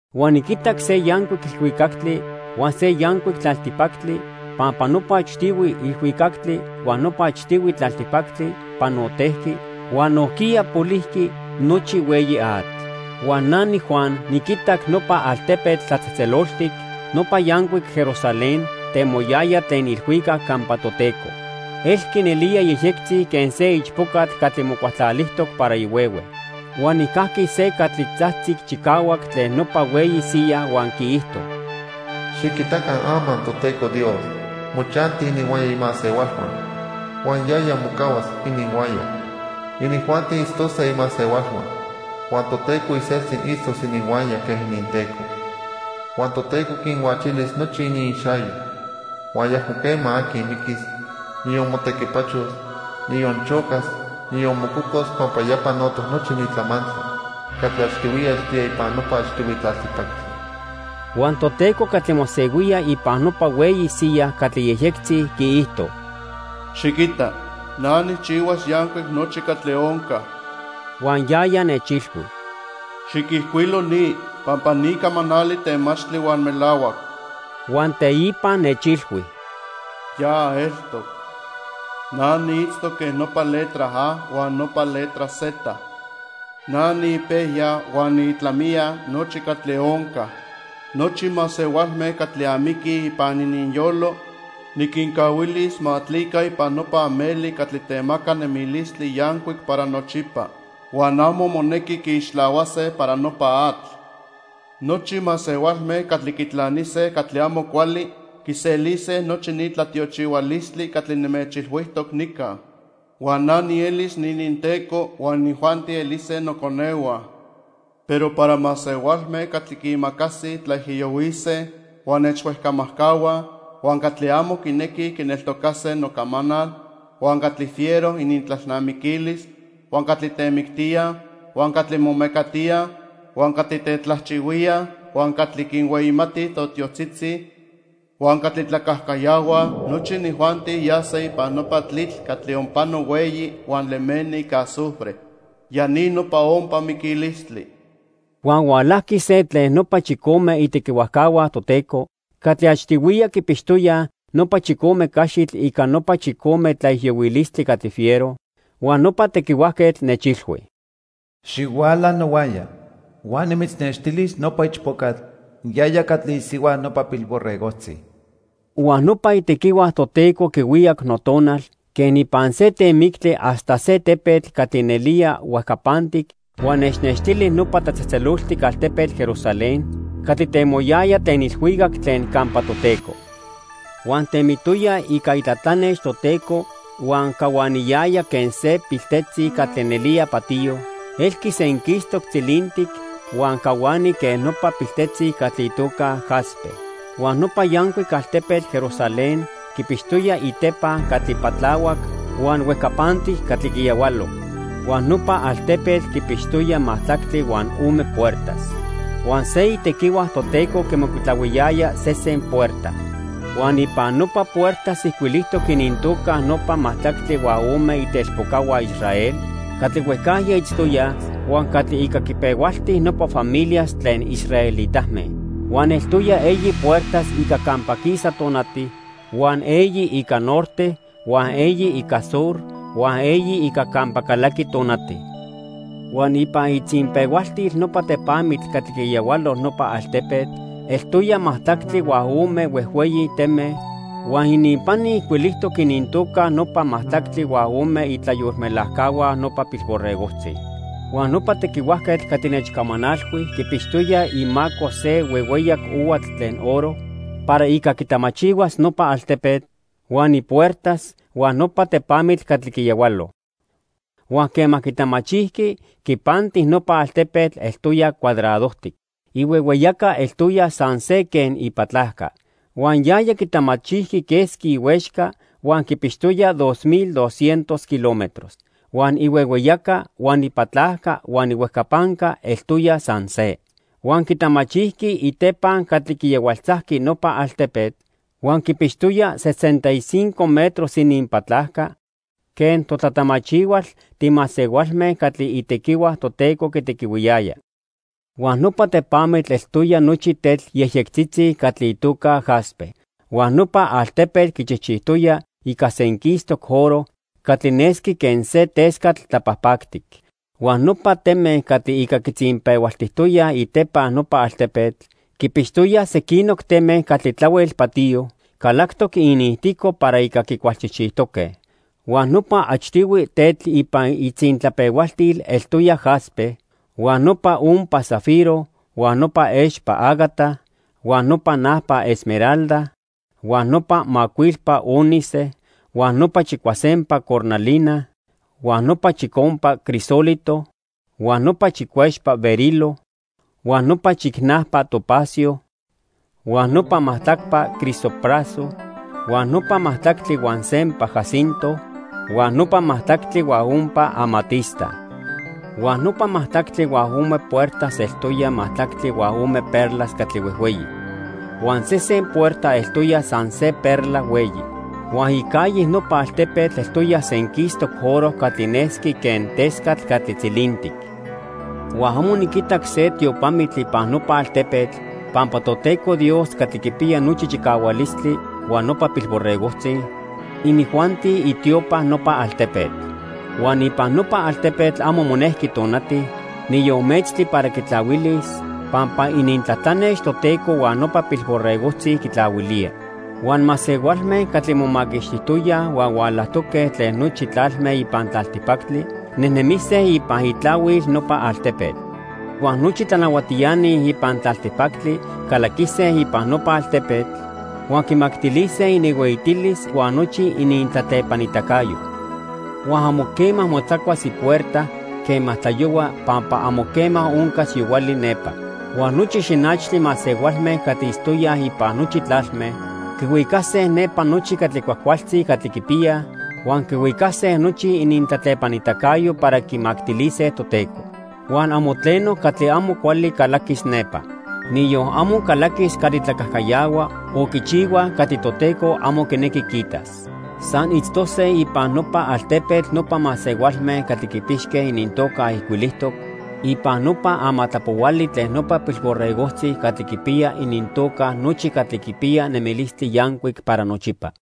Huan niquitac se yancuic ilhuicactli huan se yancuic tlaltipactli pampa nopa achtihui ilhuicactli huan nopa achtihui tlaltipactli panotejqui huan nojquiya polijqui nochi hueyi atl. Huan na niJuan niquitac nopa altepetl tlatzejtzeloltic, nopa yancuic Jerusalén temoyaya tlen ilhuicac campa Toteco. Elqui nelía yejyectzi quen se ichpocatl catli mocualtlalijtoc para ihuehue. Huan nijcajqui se catli tzajtzic chicahuac tlen nopa hueyi siya huan quiijto: "Xiquitaca ama Toteco Dios mochanti ininhuaya imasehualhua huan yaya mocahuas ininhuaya. Inijuanti itztose imasehualhua huan Toteco iseltzi itztos ininhuaya quen ininTeco. Huan Toteco quinhuachilis nochi iniixayo. Huan ayacmo quema aqui miquis, niyon motequipachos, niyon chocas, niyon mococos pampa ya panotoc nochi ni tlamantli catli achtihuiya eltoya ipan nopa achtihui tlaltipactli." Huan Toteco catli mosehuía ipan nopa hueyi siya catli yejyectzi quiijto: "Xiquita, na nijchijchihuas yancuic nochi catli onca." Huan yaya nechilhui: "Xiquijcuilo ni pampa ni camanali temachtli huan melahuac." Huan teipa nechilhui: "Ya eltoc. Na niitztoc quen nopa letra A huan nopa letra Z. Na niipejya huan niitlamiya nochi catli onca. Nochi masehualme catli amiquij ipan ininyolo, niquincahuilis ma atlica ipan nopa ameli catli temaca nemilistli yancuic para nochipa huan amo monequi quiixtlahuase para nopa atl. Nochi masehualme catli quitlanise catli amo cuali quiselise nochi ni tlatiochihualistli catli nimechilhuijtoc nica. Huan na nielis niininTeco, huan inijuanti elise noconehua. Pero para masehualme catli quiimacasij tlaijiyohuise huan nechhuejcamajcahuaj, huan catli amo quinequij quineltocase nocamanal, huan catli fiero inintlalnamiquilis, huan catli temictíaj, huan catli momecatíaj, huan catli tetlajchihuíaj, huan catli quinhueyimatij totiotzitzi, huan catli tlacajcayahuaj, nochi inijuanti yase ipan nopa tlitl catli onpano hueyi huan lemeni ica azufre. Ya ni nopa ompa miquilistli." Huan hualajqui se tlen nopa chicome itequihuajcahua Toteco catli achtihuiya quipixtoyaj nopa chicome caxitl ica nopa chicome tlaijiyohuilistli catli fiero, huan nopa tequihuajquetl nechilhui: "Xihuala nohuaya huan nimitznextilis nopa ichpocatl, yaya catli isihua nopa Pilborregojtzi." Huan nopa itequihua Toteco quihuicac notonal quen ipan se temictli hasta se tepetl catli nelía huejcapantic huan nechnextili nopa tlatzejtzeloltic altepetl, Jerusalén, catli temoyaya tlen ilhuicac tlen campa Toteco. Huan temitoya ica itlatlanex Toteco huan cahuaniyaya quen se piltetzi catli nelía patiyo; elqui senquistoc tzilintic huan cahuani quen nopa piltetzi catli itoca jaspe. Huan nopa yancuic altepetl Jerusalén quipixtoya itepa catli patlahuac huan huejcapantic catli quiyahualo. Huan nopa altepetl quipixtoya majtlactli huan ome puertas. Huan se itequihua Toteco quimocuitlahuiyaya sesen puerta. Huan ipan nopa puertas ijcuilijtoc inintoca nopa majtlactli huan ome itelpocahua Israel catli huejcajya itztoyaj huan catli ica quipehualti nopa familias tlen israelitame. Huan eltoya eyi puertas ica campa quisa tonati, huan eyi ica norte, huan eyi ica sur, huan eyi ica campa calaqui tonati. Huan ipan itzinpehualtil nopa tepamitl catli quiyahualo nopa altepetl eltoya majtlactli huan ome huejhueyi teme huan ininpani ijcuilijtoc inintoca nopa majtlactli huan ome itlayolmelajcahua nopa Pilborregojtzi. Huan nopa tequihuajquetl catli nechcamanalhui quipixtoya imaco se huehueyac ohuatl tlen oro para ica quitamachihuas nopa altepetl, huan ipuertas, huan nopa tepamitl catli quiyahualo. Huan quema quitamachijqui, quipanti nopa altepetl eltoya cuadradojtic. Ihuehueyaca eltoya san se quen ipatlajca. Huan yaya quitamachijqui quesqui ihuexca huan quipixtoya dos mil doscientos kilómetros. Huan ihuehueyaca huan ipatlajca huan ihuejcapanca eltoya san se. Huan quitamachijqui itepa catli quiyahualtzajqui nopa altepetl huan quipixtoya sesenta y cinco metros ininpatlajca quen totlatamachihual timasehualme catli itequihua Toteco quitequihuiyaya. Huan nopa tepamitl eltoya nochi tetl yejyectzitzi catli itoca jaspe. Huan nopa altepetl quichijchijtoya ica senquistoc oro catli nesqui quen se tescatl tlapajpactic. Huan nopa teme catli ica quitzinpehualtijtoyaj itepa nopa altepetl quipixtoya sequinoc teme catli tlahuel patiyo calactoc iniijtico para ica quicualchijchijtoque. Huan nopa achtihui tetl ipan itzintlapehualtil eltoya jaspe, huan nopa ompa zafiro, huan nopa expa ágata, huan nopa najpa esmeralda, huan nopa macuilpa ónice, huan nopa chicuasempa cornalina, huan nopa chicompa crisólito, huan nopa chicuexpa berilo, huan nopa chicnajpa topacio, huan nopa majtlacpa crisopraso, huan nopa majtlactli huan sempa jacinto, huan nopa majtlactli huan ompa amatista. Huan nopa majtlactli huan ome puertas eltoya majtlactli huan ome perlas catli huejhueyi. Huan sesen puerta eltoya san se perla hueyi. Huan icalle nopa altepetl eltoya senquistoc oro catli nesqui quen tescatl catli tzilintic. Huan amo niquitac se tiopamitl ipan nopa altepetl pampa Toteco Dios Catli Quipiya Nochi Chicahualistli huan nopa Pilborregojtzi, inijuanti itiopa nopa altepetl. Huan ipan nopa altepetl amo monejqui tonati, niyon metztli para quitlahuilis pampa inintlatlanex Toteco huan nopa Pilborregojtzi quitlahuilía. Huan masehualme catli momaquixtijtoyaj huan hualajtoque tlen nochi tlalme ipan tlaltipactli nejnemise ipan itlahuil nopa altepetl. Huan nochi tlanahuatiani ipan tlaltipactli calaquise ipan nopa altepetl huan quimactilise ininhueyitilis huan nochi inintlatlepanitacayo. Huan amo quema motzacuas ipuerta quema tlayohua pampa amo quema oncas yohuali nepa. Huan nochi xinachtli masehualme catli itztoyaj ipan nochi tlalme quihuicase nepa nochi catli cuajcualtzi catli quipiyaj, huan quihuicase nochi inintlatlepanitacayo para quimactilise Toteco. Huan amo tleno catli amo cuali calaquis nepa. Niyon amo calaquis catli tlacajcayahua o quichihuaj catli Toteco amo quinequi quiitas. San itztose ipan nopa altepetl nopa masehualme catli quipixque inintoca ijcuilijtoc ipan nopa amatlapohuali tlen nopa Pilborregojtzi catli quipiya inintoca nochi catli quipiyaj nemilistli yancuic para nochipa.